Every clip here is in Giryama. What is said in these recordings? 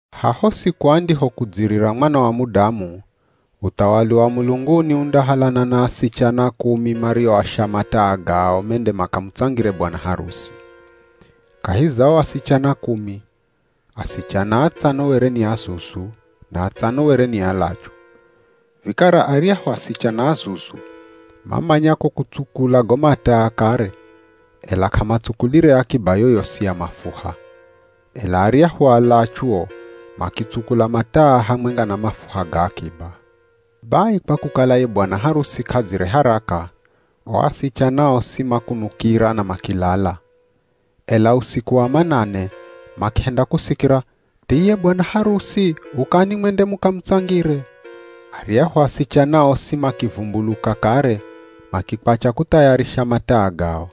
“Haho siku andihokudzirira Mwana wa Mudamu, uthawali wa mulunguni undahalana na asichana kumi marioasha mataa gao mende makamutsangire bwana harusi. Kahi za o asichana kumi, asichana atsano were ni azuzu, na atsano were ni alachu. Vikara aryahu asichana azuzu, mamanya ko kutsukula go mataa kare ela k'amatsukulire akiba yoyosi ya mafuha. Ela arya alachu o makitsukula mataa hamwenga na mafuha ga akiba. Bai kwa kukala ye bwana harusi k'adzire haraka, o asichana osi makunukira na makilala. Ela usiku wa manane, makihenda kusikira, ‘Thiye bwana harusi ukani mwende mukamutsangire.’ Aryahu asichana osi makivumbuluka kare makikwacha kuthayarisha mataa gao.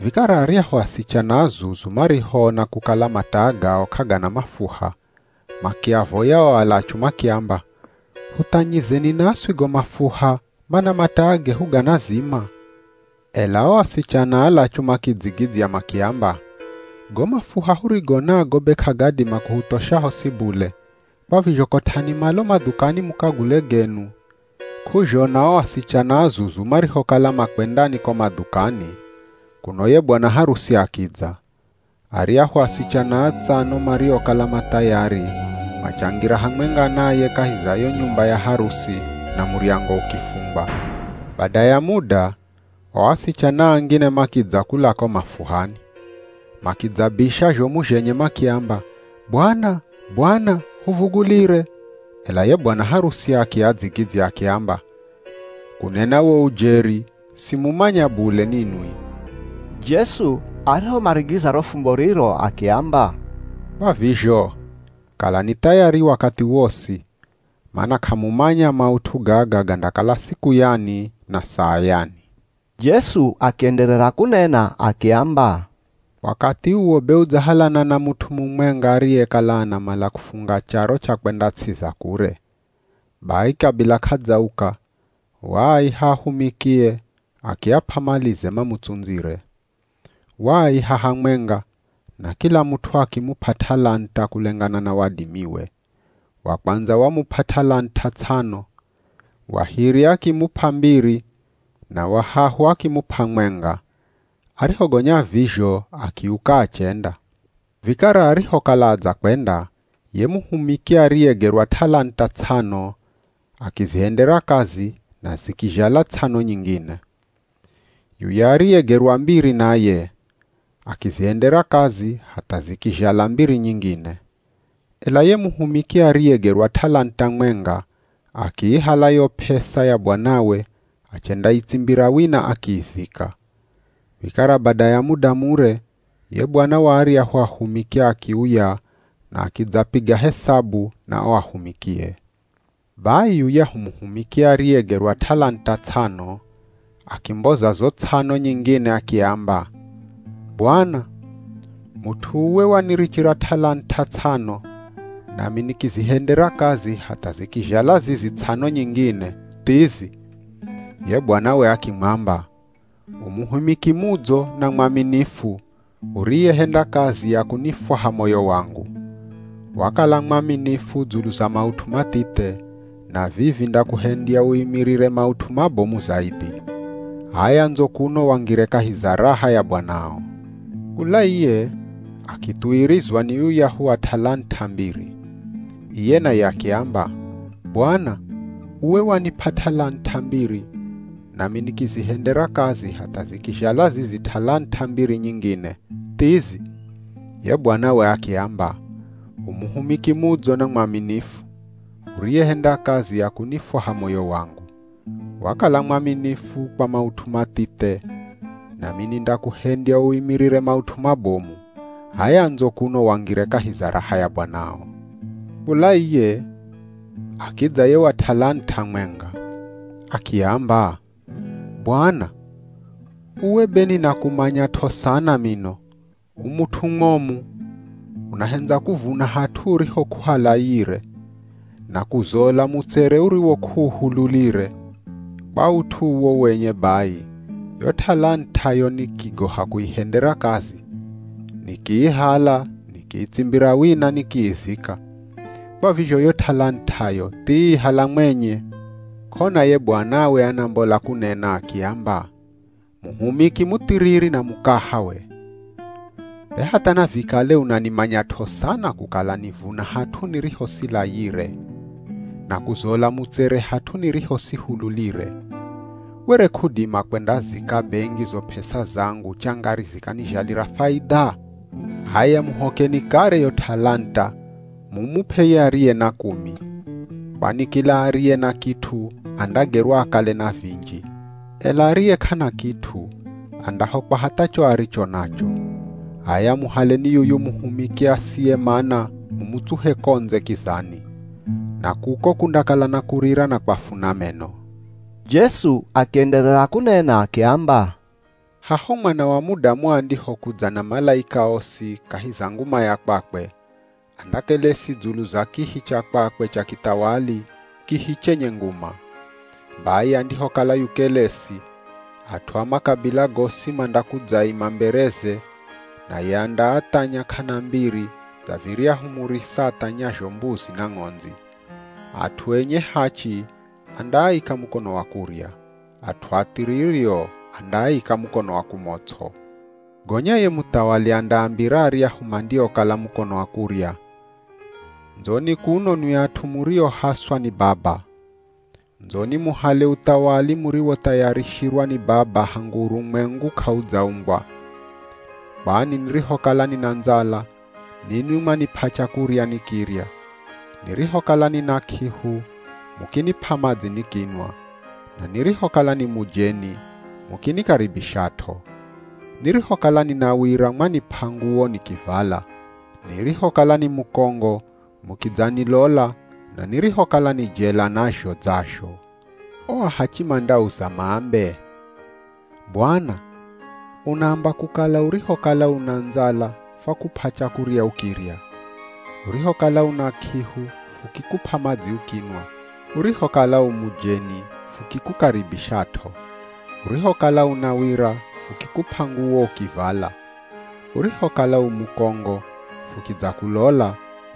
Vikara aryahu asichana azuzu marihoona kukala mataa gao k'agana mafuha, makiavoya o alachu makiamba, ‘Huthanyizeni naswi go mafuha, mana mataa gehu ganazima.’ Ela o asichana alachu makidzigidzya makiamba, ‘Go mafuha hurigo nago be k'agadima kuhuthosha hosi bule, kwa vizho kot'ani malo madhukani mukagule genu.’ K'uzhona o asichana azuzu marihokala makwendani ko madhukani, kuno ye bwana harusi akidza. Aryahu asichana atsano mariokala ma thayari, machangira hamwenga naye kahi za yo nyumba ya harusi na muryango ukifungwa.” “Bada ya muda, o asichana angine makidza kula ko mafuhani. Makidzabisha zhomu zhenye makiamba, ‘Bwana, bwana, huvugulire!’ Ela ye bwana harusi akiadzigidzya akiamba, ‘Kunena wo ujeri, simumanya bule ninwi.’” Jesu arihomarigiza ro fumbo riro akiamba, “Kwa vizho, kalani thayari wakathi wosi, mana k'amumanya maut'u gaga gandakala siku yani na saa yani.” Jesu akienderera kunena akiamba, “Wakathi uwo be udzahalana na mut'u mumwenga ariyekala anamala kufunga charo cha kwenda ts'i za kure. Bai kabila k'adzauka, waaiha ahumikie akiap'a malize mamutsundzire. Waaiha hamwenga, na kila mut'u akimup'a t'alant'a kulengana na wadimiwe. Wa kwandza wamup'a t'alant'a ts'ano. Wa hiri akimup'a mbiri, na wa hahu akimup'a mwenga. Arihogonya vizho akiuka achenda. Vikara arihokala adzakwenda, ye muhumiki ariyegerwa t'alant'a ts'ano, akizihendera kazi na zikizhala ts'ano nyingine. Yuya ariyegerwa mbiri naye, akizihendera kazi hatha zikizhala mbiri nyingine. Ela ye muhumiki ariyegerwa t'alant'a mwenga, akiihala yo p'esa ya bwanawe achendaitsimbira wina akiizika.” “Vikara bada ya muda mure, ye bwana wa aryahu ahumiki akiuya na akidzapiga hesabu na o ahumikie. Bai yuyahu muhumiki ariyegerwa t'alant'a ts'ano, akimboza zo ts'ano nyingine akiamba, ‘Bwana, mut'u uwe wanirichira t'alant'a ts'ano, nami nikizihendera kazi hatha zikizhala zizi ts'ano nyingine, thizi.’ Ye bwanawe akimwamba, ‘U muhumiki mudzo na mwaminifu, uriyehenda kazi ya kunifwaha moyo wangu. Wakala mwaminifu dzulu za maut'u mathithe, na vivi ndakuhendya uimirire maut'u mabomu zaidhi. H'aya ndzo kuno wangire kahi za raha ya bwanao.’ “Kula iye, akithuwirizwa ni yuyahu wa t'alant'a mbiri. Iye naye akiamba, ‘Bwana, uwe wanip'a t'alant'a mbiri, nami nikizihendera kazi hatha zikizhala zizi t'alant'a mbiri nyingine, thizi.’ Ye bwanawe akiamba, ‘U muhumiki mudzo na mwaminifu, uriyehenda kazi ya kunifwaha moyo wangu. Wakala mwaminifu kwa maut'u mathithe nami nindakuhendya uimirire maut'u mabomu. H'aya ndzo kuno wangire kahi raha ya bwanao.’ Kula iye, akidza ye wa t'alant'a mwenga. Akiamba, ‘Bwana, uwe be ninakumanyat'o sana mino. U mut'u mwomu. Unahendza kuvuna hat'u uriho k'uhalayire, na kuzola mutsere uriwo k'uuhululire. Kwa ut'u uwo wenye bai, yo t'alant'ayo nikigoha kuihendera kazi. Nikiihala nikiitsimbira wina nikiizika. Kwa vizho yo t'alant'ayo thii hala mwenye.’ K'ona ye bwanawe anambola kunena akiamba, ‘Muhumiki muthiriri na mukaha we. Be hatha navikale unanimanyat'o sana kukala nivuna hat'u niriho silayire, na kuzola mutsere hat'u niriho sihululire. Were k'udima kwendazika bengi zo p'esa zangu changari zikanizhalira faidha? H'aya muhokeni kare yo t'alant'a mumup'e ye ariye na kumi. Kwani kila ariye na kit'u andagerwa akale na vinji. Ela ariye k'ana kit'u, andahokwa hatha cho aricho nacho. H'aya muhaleni yuyu muhumiki asiye mana mumutsuhe ko ndze kizani. Na kuko kundakala na kurira na kwafuna meno.’” Jesu akienderera kunena akiamba, “Haho Mwana wa Mudamu andihokudza na malaika osi kahi za nguma ya kwakwe, andakelesi dzulu za kihi cha kwakwe cha kithawali, kihi chenye nguma. Bai andihokala yukelesi, at'u a makabila gosi mandakudzaima mbereze, naye andaathanya k'ana mbiri dza viryahu murisa athanyazho mbuzi na ng'ondzi. At'u enye hachi andaaika mukono wa kurya. At'u athiriri o andaaika mukono wa kumots'o. Gonya ye Muthawali andaambira aryahu mandiokala mukono wa kurya, ‘Ndzoni kuno nwi at'u muriohaswa ni Baba. Ndzoni muhale uthawali muriwothayarishirwa ni Baba hangu urumwengu k'audzaumbwa. Kwani nirihokala nina ndzala, ninwi mwanip'a chakurya nikirya. Nirihokala nina k'ihu, mukinip'a madzi nikinwa. Na nirihokala ni mujeni mukinikaribishat'o. Nirihokala nina wira mwanip'a nguwo nikivala. Nirihokala ni mukongo mukidzanilola, na nirihokala ni jela nazho dzazho.’ O ahachi mandauza maambe, ‘Bwana, unaamba kukala urihokala una ndzala fwakup'a chakurya ukirya. Urihokala una k'ihu fukikup'a madzi ukinwa. Urihokala u mujeni fukikukaribishat'o. Urihokala una wira fukikup'a nguwo ukivala. Urihokala u mukongo fukidzakulola,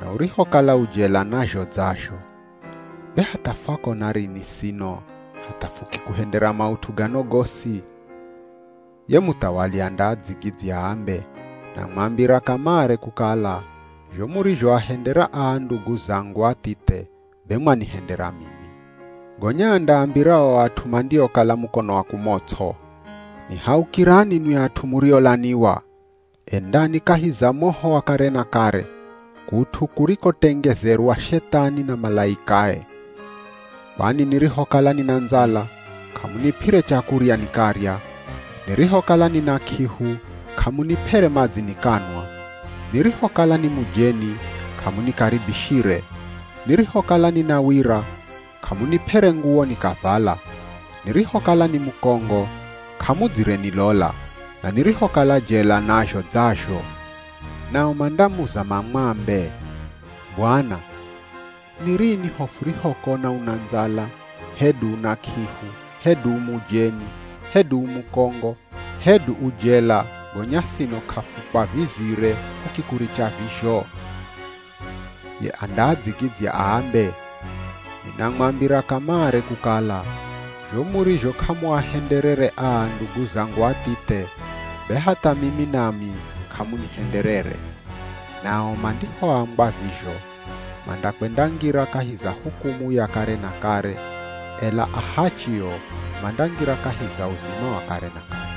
na urihokala u jela nazho dzazho. Be hatha fwakona rini sino hatha fukikuhendera maut'u gano gosi?’ Ye Muthawali andaadzigidzya aambe, ‘Namwambira kamare kukala, zho murizhoahendera aa ndugu zangu athithe be mwanihendera mimi.’ “Gonya andaambira o at'u mandiokala mukono wa kumots'o, ‘Nihaukirani nwi at'u muriolaniwa. Endani kahi za moho wa kare na kare, kut'u kurikotengezerwa Shethani na malaikae! Kwani nirihokala nina ndzala, k'amunip'ere chakurya nikarya. Nirihokala nina k'ihu k'amunip'ere madzi nikanwa. Nirihokala ni mujeni k'amunikaribishire. Nirihokala nina wira k'amunip'ere nguwo nikavala. Nirihokala ni mukongo k'amudzire nilola, na nirihokala jela nazho dzazho.’ Nao mandamuza mamwambe, ‘Bwana, ni rini ho furihokona una ndzala, hedu una k'ihu, hedu u mujeni, hedu u mukongo, hedu u jela gonya sino k'afukwavizire fukikuricha vizho?’ Ye andaadzigidzya aambe, ‘Ninamwambira kamare kukala, zho murizho k'amuahenderere aa ndugu zangu athithe, be hatha mimi nami k'amunihenderere.’ Nao mandihoambwa vizho, mandakwendangira kahi za hukumu ya kare na kare, ela ahachi o, mandangira kahi za uzima wa kare na kare.”